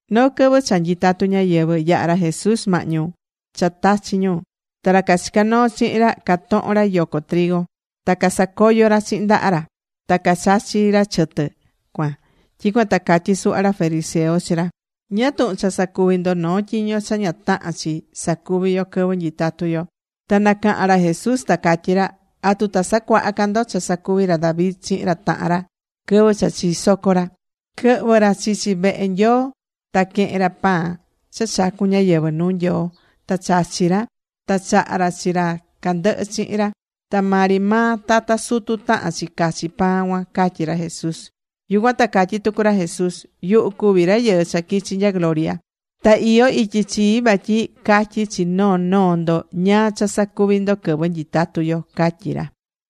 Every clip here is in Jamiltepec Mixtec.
Noo quɨvɨ cha nyitatu ñáyɨvɨ, yahá ra Jesús mahñu cha tachi̱ ñu. Ta ra cachicá noo chihin ra catohón ra yoco. Ta casacoyó ra chihin ndaha ra. Ta cachachí ra chɨtɨ cuan. Tyicuan ta catyí suhva ra fariseo chi ra: ―¿Ñáá tuhun cha sacuví ndo noo tyiño cha ña tahán chi sacuvi yo quɨvɨ nyitatu yo? Ta nacaha̱n ra Jesús, ta catyí ra: ―¿Atu ta sacuaha ca ndo cha sacuvi̱ ra David chihin ra tahan ra quɨvɨ cha chisoco ra? Quɨhvɨ̱ ra chichi vehe Nyoo. Ta quehe̱n ra pan cha chacu̱n ñáyɨvɨ nuu Nyoo. Ta chachi̱ ra. Ta chaha̱ ra chi ra candɨhɨ chihin ra. Ta maa ri maa tata sutu tahán chi cachi pan cuan ―catyí ra Jesús. Yucuan ta catyí tucu ra Jesús: ―Yuhu cuví Rayɨɨ cha quichi̱ nya gloria. Ta iyó ityi chii vatyi catyi chi noo noo ndo ñáá cha sacuvi ndo quɨvɨ nyitatu yo ―catyí ra.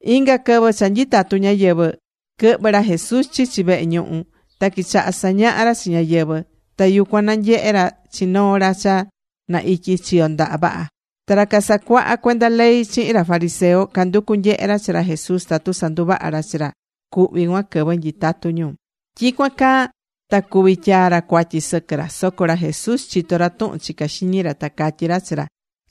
Inga quɨvɨ cha nyitatu ñáyɨvɨ, quɨhvɨ ra Jesús chichi vehe ñuhu. Ta quichaha sañaha ra chi ñáyɨvɨ. Ta yucuan nanyehe̱ ra chi noo ra cha na ityi chiyo ndaha vaha. Ta ra casacuaha cuenda ley chihin ra fariseo, canducú nyehe ra chi ra Jesús, tatu sanduvaha ra chi ra cuhví cuan quɨvɨ nyitatu ñu. Tyicuan caa ta cuvi tyaa ra cuatyi sɨquɨ ra. Soco ra Jesús chitó ra tuhun chicá xiñi ra. Ta catyí ra chi ra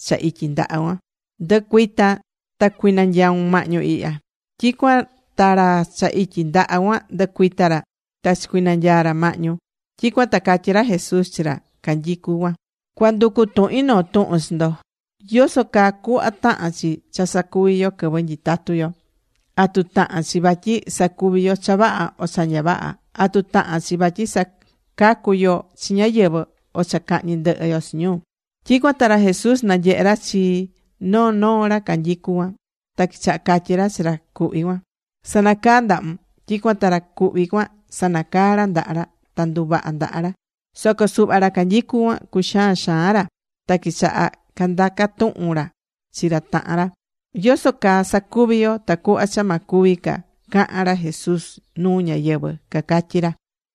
cha ityi ndaha cuan: ―Ndu̱cuita. Ta cuinanyaun mahñu ihya. Tyicuan ta ra cha ityi ndaha cuan nducuita̱ ra. Ta chicunanyaa̱ ra mahñu. Tyicuan ta catyí ra Jesús chi ra canyicú cuan: ―Cua nducu tuhin noo tuhun chi ndo. ¿Yoso caa cuhva tahán chi cha sacuvi yo quɨvɨ nyitatú yo? ¿Atu tahán chi vatyi sacuvi yo cha vaha, o cha ña vaha? ¿Atu tahán chi vatyi sacacu yo chi ñáyɨvɨ, o cha cahñi ndɨhɨ yo chi ñu? Tyicuan ta ra Jesús nanyehe̱ ra chi noo noo ra canyicú cuan. Ta quichaha catyi ra chi ra cuhví cuan: ―Sa̱nacaa ndahun. Tyicuan ta ra cuhví cuan sanacaa̱ ra ndaha ra. Ta nduvaha̱ ndaha ra. Soco suhva ra canyicú cuan, cuxaa̱n xaan ra. Ta quichaha̱ candaca tuhun ra chi ra tahan ra: ―¿Yoso caa sacuví yo tacuhva cha ma cuvi ca cahan ra Jesús nuu ñáyɨvɨ? ―cacatyí ra.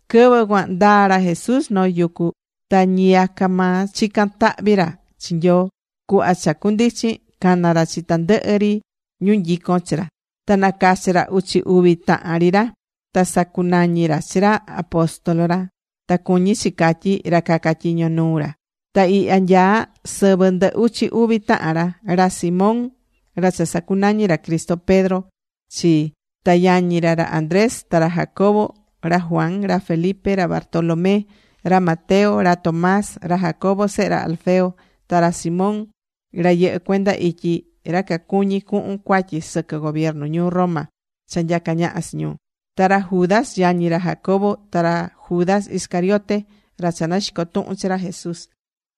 Quɨvɨ cuan ndaa̱ ra Jesús noo yucu. Ta ñiyaca maa chicán tahvi ra chi Nyoo. Cuhva cha cundichin, cana̱ ra chi tandɨhɨ ri ñu nyicón chi ra. Ta nacachi̱ ra uchi uvi tahan ri ra. Ta sacunañi̱ ra chi ra, apóstol ra, ta cuñí chi catyí, ra caca tyiño nuu ra. Ta ihya nyaá sɨvɨ ndɨ uchi uvi tahan ra: Ra Simón ra cha sacunañi̱ ra Cristo Pedro chi, ta yañi ra, ra Andrés, ta ra Jacobo, ra Juan, ra Felipe, ra Bartolomé, ra Mateo, ra Tomás, ra Jacobo sehe ra Alfeo, ta ra Simón ra yɨhɨ̱ cuenda ityi ra cacuñí cuhun cuatyi sɨquɨ gobiernu ñuu Roma cha nyacá ñaha chi ñu. Ta ra Judas, yañi ra Jacobo, ta ra Judas Iscariote, ra cha naxico̱ tuhun chi ra Jesús.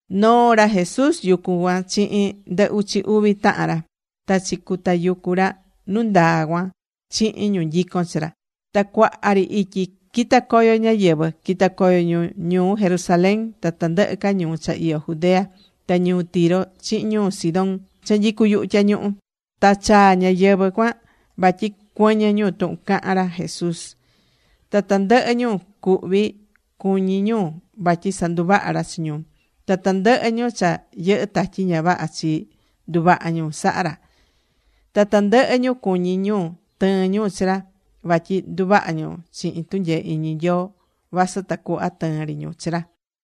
Noo̱ ra Jesús yucu cuan chihin ndɨ uchi uvi tahan ra. Ta chicutayucu̱ ra nu ndaa cuan chihin ñu nyicón chi ra. Ta cuaha ri ityi quita̱ coyo ñáyɨvɨ. Quita̱ coyo ñu ñuu Jerusalén ta tandɨhɨ ca ñuu cha iyó Judea, ta ñuu Tiro chihin ñuu Sidón cha nyicú yuhu tyañuhu. Ta chaa̱ ñáyɨvɨ cuan vatyi cuɨñɨ ñu tuhun cahán ra Jesús. Ta tandɨhɨ ñu cuhví cuñí ñu vatyi sanduvaha ra chi ñu. Ta tandɨhɨ ñu cha yɨhɨ́ tatyi ña vaha chi, nduvaha̱ ñu saha̱ ra. Ta tandɨhɨ ñu cuñí ñu tɨɨn ñu chi ra. Vatyi nduvaha ñu chihin tunyee iñi Nyoo, vasɨ tacuhva tɨɨn ri ñu chi ra.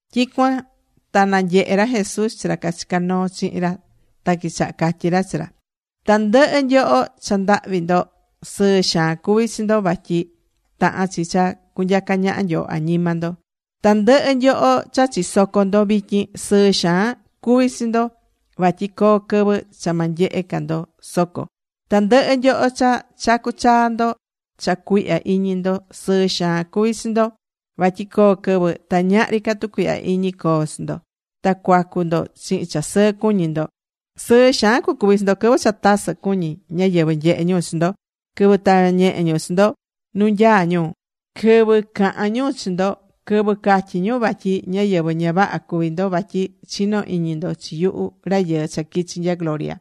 Tyicuan ta nanyehe̱ ra Jesús chi ra cachicá noo chihin ra. Ta quichaha̱ catyí ra chi ra: ―Tandɨhɨ nyoho cha ndahvi ndo, sɨɨ xaan cuví chi ndo, vatyi tahán chi cha cunyaca ñaha Nyoo añima ndo. ’Tandɨhɨ nyoho cha chisocó ndo vityin, sɨɨ xaan cuví chi ndo. Vatyi coo quɨvɨ cha ma nyehe ca ndo soco. Tandɨhɨ nyoho cha chacú chaa ndo cha cuihya iñi ndo, sɨɨ xaan cuví chi ndo vatyi coo quɨvɨ ta ñahri ca tucuihya iñi coo chi ndo. Ta cuacu ndo chihin cha sɨɨ cuñi ndo. ’Sɨɨ xaan cucuvi chi ndo, quɨvɨ cha tasɨ cuñí ñáyɨvɨ nyehé ñu chi ndo, quɨvɨ tavá ñehe ñu chi ndo nu nyaá ñu, quɨvɨ cahán ñu chi ndo, quɨvɨ catyí ñu vatyi ñáyɨvɨ ña vaha cuví ndo vatyi chinó iñi ndo chi yuhu Rayɨɨ cha quichi̱ nya gloria.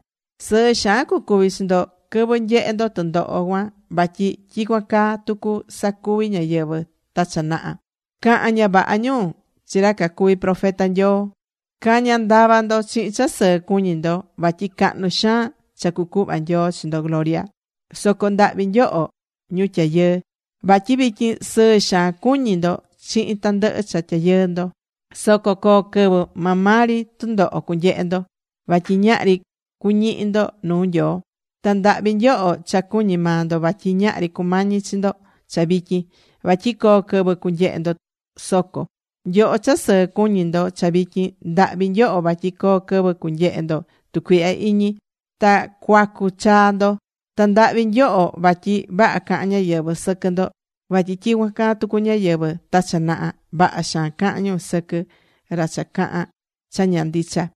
Sɨɨ xaan cucuvi chi ndo quɨvɨ nyehe ndo tɨndoho cuan vatyi tyicuan caa tucu sacuvi̱ ñáyɨvɨ ta cha naha. Caha̱n vavaha ñu chi ra cacuvi profeta Nyoo. Ca̱ña ndava ndo chihin cha sɨɨ cuñí ndo. Vatyi cahnu xaan cha cucuhva Nyoo chi ndo gloria. ’Soco ndahvi nyoho, ñu tyayɨɨ. Vatyi vityin sɨɨ xaan cuñí ndo chihin tandɨhɨ cha tyayɨɨ ndo. Soco coo quɨvɨ maa maa ri tundoho cunyehe ndo. Vatyi ñahri cuñihi ndo nuu Nyoo. ’Ta ndahvi nyoho cha cuñí maa ndo vatyi ñahri cumañí chi ndo cha vityin, vatyi coo quɨvɨ cunyehe ndo soco. Nyoho cha sɨɨ cuñí ndo cha vityin, ndahvi nyoho vatyi coo quɨvɨ cunyehe ndo tucuihya iñi. Ta cuacu chaa ndo. Ta ndahvi nyoho vatyi vaha cahán ñáyɨvɨ sɨquɨ ndo. Vatyi tyicuan caa tucu ñáyɨvɨ ta cha naha, vaha xaan caha̱n ñu sɨquɨ ra cha caha̱n cha ña ndicha.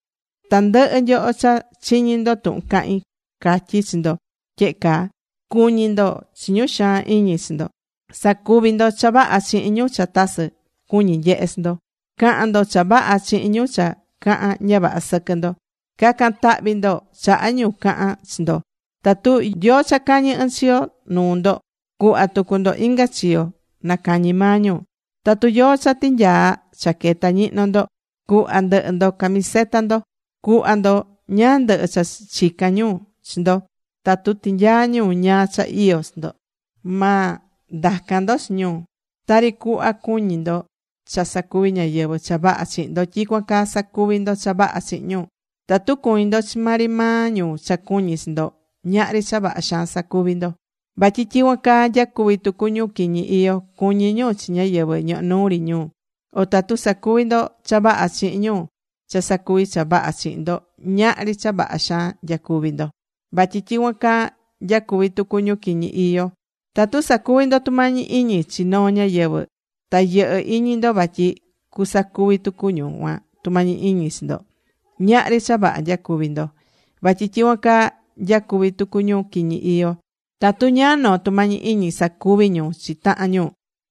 ’Tandɨhɨ nyoho cha chiñí ndo tuhun cahín, catyí chi ndo tyehe caa: Cu̱ñi ndo chi ñu xaan iñi chi ndo. Sa̱cuvi ndo cha vaha chihin ñu cha tasɨ cuñi nyehe chi ndo. Ca̱han ndo cha vaha chihin ñu cha cahán ña vaha sɨquɨ ndo. Ca̱can tahvi ndo chaha ñu cahán chi ndo. Tatu yóó cha cañi̱ ɨnchiyo nuu ndo, cuhva tucu ndo inga chiyo nacañi maa ñu. Tatu yóó cha tinyaa chaqueta ñihno ndo, cu̱hva ndɨhɨ ndo camiseta ndo. Cu̱hva ndo ñáá ndɨhɨ cha chicán ñu chi ndo. Tatu tinyaa ñu ñáá cha iyó chi ndo, ma ndacan ndo chi ñu. Tari cuhva cuñí ndo cha sacuvi ñáyɨvɨ cha vaha chihin ndo, tyicuan caa sa̱cuvi ndo cha vaha chihin ñu. ’Tatu cuñí ndo chi maa ri maa ñu cha cuñí chi ndo, ñahri cha vaha xaan sacuví ndo. Vatyi tyicuan caa nyacuví tucu ñu quiñi iyó, cuñí ñu chi ñáyɨvɨ ñohó nuu ri ñu. O tatu sacuví ndo cha vaha chihin ñu cha sacuví cha vaha chihin ndo, ñahri cha vaha xaan nyacuví ndo. Vatyi tyicuan caa nyacuví tucu ñu quiñi iyó. O tatu sacuví ndo tumañi iñi chi noo ñáyɨvɨ, ta yɨhɨ́ iñi ndo vatyi cusacuvi tucu ñu cuan tumañi iñi chi ndo, ñahri cha vaha nyacuví ndo. Vatyi tyicuan caa nyacuví tucu ñu quiñi iyó. Tatu ñáá noo tumañi iñi sacuví ñu chi tahan ñu,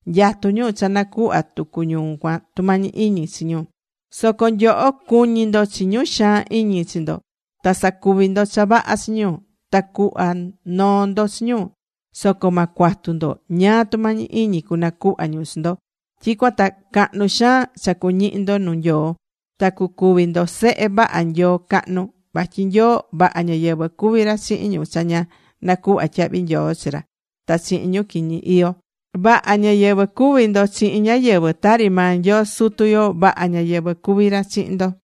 nyatú ñu cha nacuhva tucu ñu cuan tumañi iñi chi ñu. Soco nyoho, cu̱ñi ndo chi ñu xaan iñi chi ndo. Ta sa̱cuvi ndo cha vaha chi ñu. Ta cu̱hva noo ndo chi ñu. Soco ma cuatu ndo ñáá tumañi iñi cunacuhva ñu chi ndo. Tyicuan ta cahnu xaan cha cuñihi ndo nuu Nyoo ta cucuvi ndo sehe vaha Nyoo cahnu. Vatyi Nyoo vaha ñáyɨvɨ cuví ra chihin ñu cha ña nacuhva tyahvi nyoo chi ra ta chihin ñu quiñi iyó. Vaha ñáyɨvɨ cu̱vi ndo chihin ñáyɨvɨ, tari maa Nyoo Sutu yo, vaha ñáyɨvɨ cuví ra chihin ndo.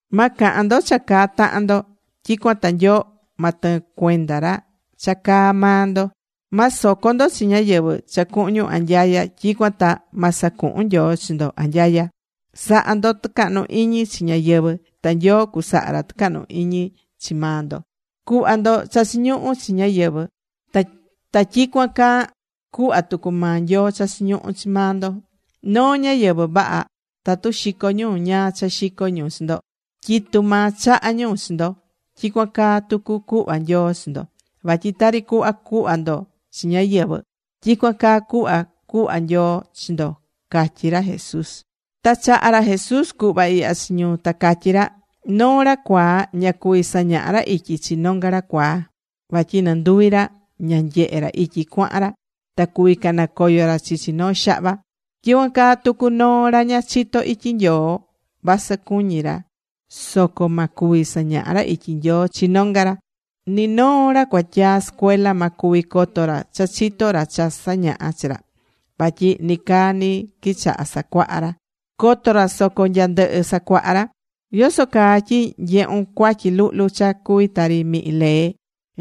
’Ma cahan ndo cha caá tahan ndo, tyicuan ta Nyoo ma tɨɨn cuenda ra cha caá maa ndo. Ma soco ndo chi ñáyɨvɨ cha cuhun ñu anyaya, tyicuan ta ma sacuhun Nyoo chi ndo anyaya. Sa̱ha ndo tucahnu iñi chi ñáyɨvɨ. Ta Nyoo cusaha ra tucahnu iñi chi maa ndo. Cu̱hva ndo cha chiñuhú chi ñáyɨvɨ. Ta tyicuan caa cuhva tucu maa Nyoo cha chiñuhú chi maa ndo. Noo ñáyɨvɨ vaha, tatu xicó ñu ñáá cha xicó ñu chi ndo, tyitu maa chahá ñu chi ndo, tyicuan caa tucu cuhva Nyoo chi ndo. Vatyi tari cuhva cuhva ndo chi ñáyɨvɨ, tyicuan caa cuhva cuhva Nyoo chi ndo ―catyí ra Jesús. Ta chaha̱ ra Jesús cuhva ihya chi ñu, ta catyí ra: ―Noo ra cuaa ña cuví sañaha ra ityi chi nonga ra cuaa. Vatyi nɨnduvi ra ña nyehé ra ityi cuahan ra. Ta cuví canacoyo ra chichi noo xahva. Tyicuan caa tucu noo ra ña chitó ityi Nyoo, vasɨ cuñí ra, soco ma cuvi sañaha ra ityi Nyoo chi nonga ra. Ni noo ra cuatyaa sɨcuela ma cuvi coto ra cha chitó ra cha sañaha chi ra. Vatyi nicaa ni quichaha sacuaha ra. Coto ra soco nya ndɨhɨ sacuaha ra. ’¿Yoso caa tyi nyehún cuatyi luhlu cha cuví tari mihin lee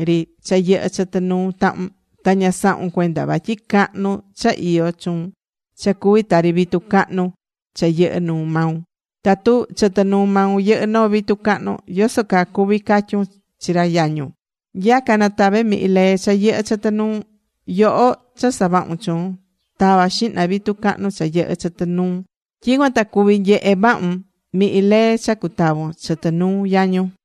ri cha yɨhɨ́ chɨtɨ nuu tahun, ta ña sahun cuenda cuatyi cahnu cha iyó chuun cha cuví tari vitu cahnu cha yɨhɨ́ nuu maun? Tatu chɨtɨ nuu maun yɨhɨ́ noo vitu cahnu, yoso caa cuví catyun chi ra yañun: “Nya̱ca, natave mihin lee cha yɨhɨ́ chɨtɨ nuun.” ¡Yoho cha savahún chuun! Ta̱va xihna vitu cahnu cha yɨhɨ́ chɨtɨ nuun. Tyicuan ta cuví nyehe vahun mihin lee cha cutavon chɨtɨ nuu yañun.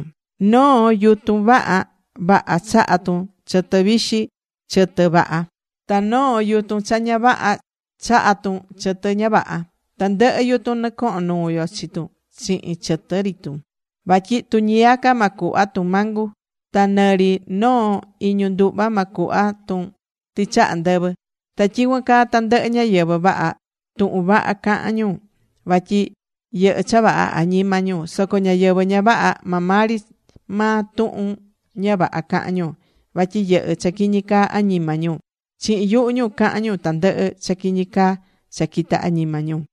’Noo yutun vaha chahá tun chɨtɨ vixi, chɨtɨ vaha. Ta noo yutun ña vaha chahá tun chɨtɨ ña vaha. Tandɨhɨ yutun nɨcohon nuu yo chi tun chihin chɨtɨ ri tun. Vatyi tuñiyaca, ma cuhva tun mangu. Ta nɨ ri noo iñu nduhva ma cuhva tun tɨchaha ndɨvɨ. Ta tyicuan caa tandɨhɨ ñáyɨvɨ vaha, tuhun vaha cahán ñu. Vatyi yɨhɨ́ cha vaha añima ñu. Soco ñáyɨvɨ ña vaha, maa maa ri maa tuhun ña vaha cahán ñu. Vatyi yɨhɨ́ cha caquiñi añima ñu. Chihin yuhu ñu cahán ñu tandɨhɨ cha quiñi caa cha quitá añima ñu.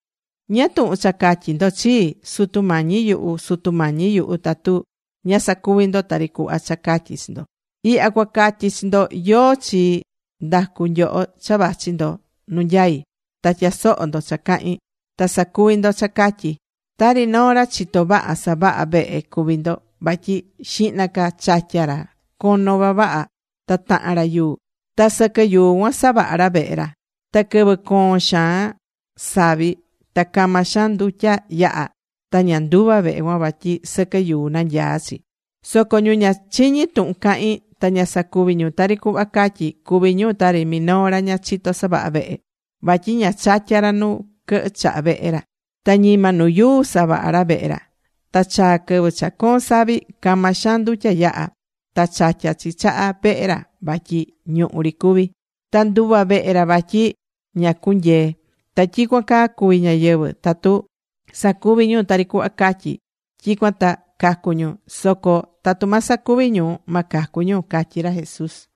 ’¿Ñáá tuhun cha catyí ndo chii, “Sutu Mañi yuhu, Sutu Mañi yuhu”, tatu ña sacuvi ndo tari cuhva cha catyí chi ndo? Ihya cua catyi chi ndo yóó chi ndacu nyoho cha vachi ndo nu nyaí, ta tyasohó ndo cha cahín, ta sacuví ndo cha catyí. Tari noo ra chitó vaha savaha vehe cuví ndo. Vatyi xihna ca chatyá ra cono vavaha ta tahan ra yuu. Ta sɨquɨ yuu cuan savahá ra vehe ra. Ta quɨvɨ coon xaan savi, ta cama xaan ndutya yahá, ta ña nduva vehe cuan vatyi sɨquɨ yuu nanyaá chi. Soco ñu cha chiñí tuhun cahín ta ña sacuví ñu tari cuhva catyí, cuví ñu tari minoo ra ña chitó savaha vehe. Vatyi ña chatyá ra nu quɨhɨ chaha vehe ra. Ta ñima nu yuu savaha̱ ra vehe ra. Ta chaa quɨvɨ cha coon savi. Cama xaan ndutya yaha. Ta chatya chi chaha vehe ra vatyi ñuhu ri cuví. Ta nduva vehe ra vatyi ña cunyee. (Ta tyicuan caa cuví ñáyɨvɨ, tatu sacuví ñu tari cuhva catyí, tyicuan ta cacu ñu. Soco tatu ma sacuvi ñu, ma cacu ñu) ―catyí ra Jesús.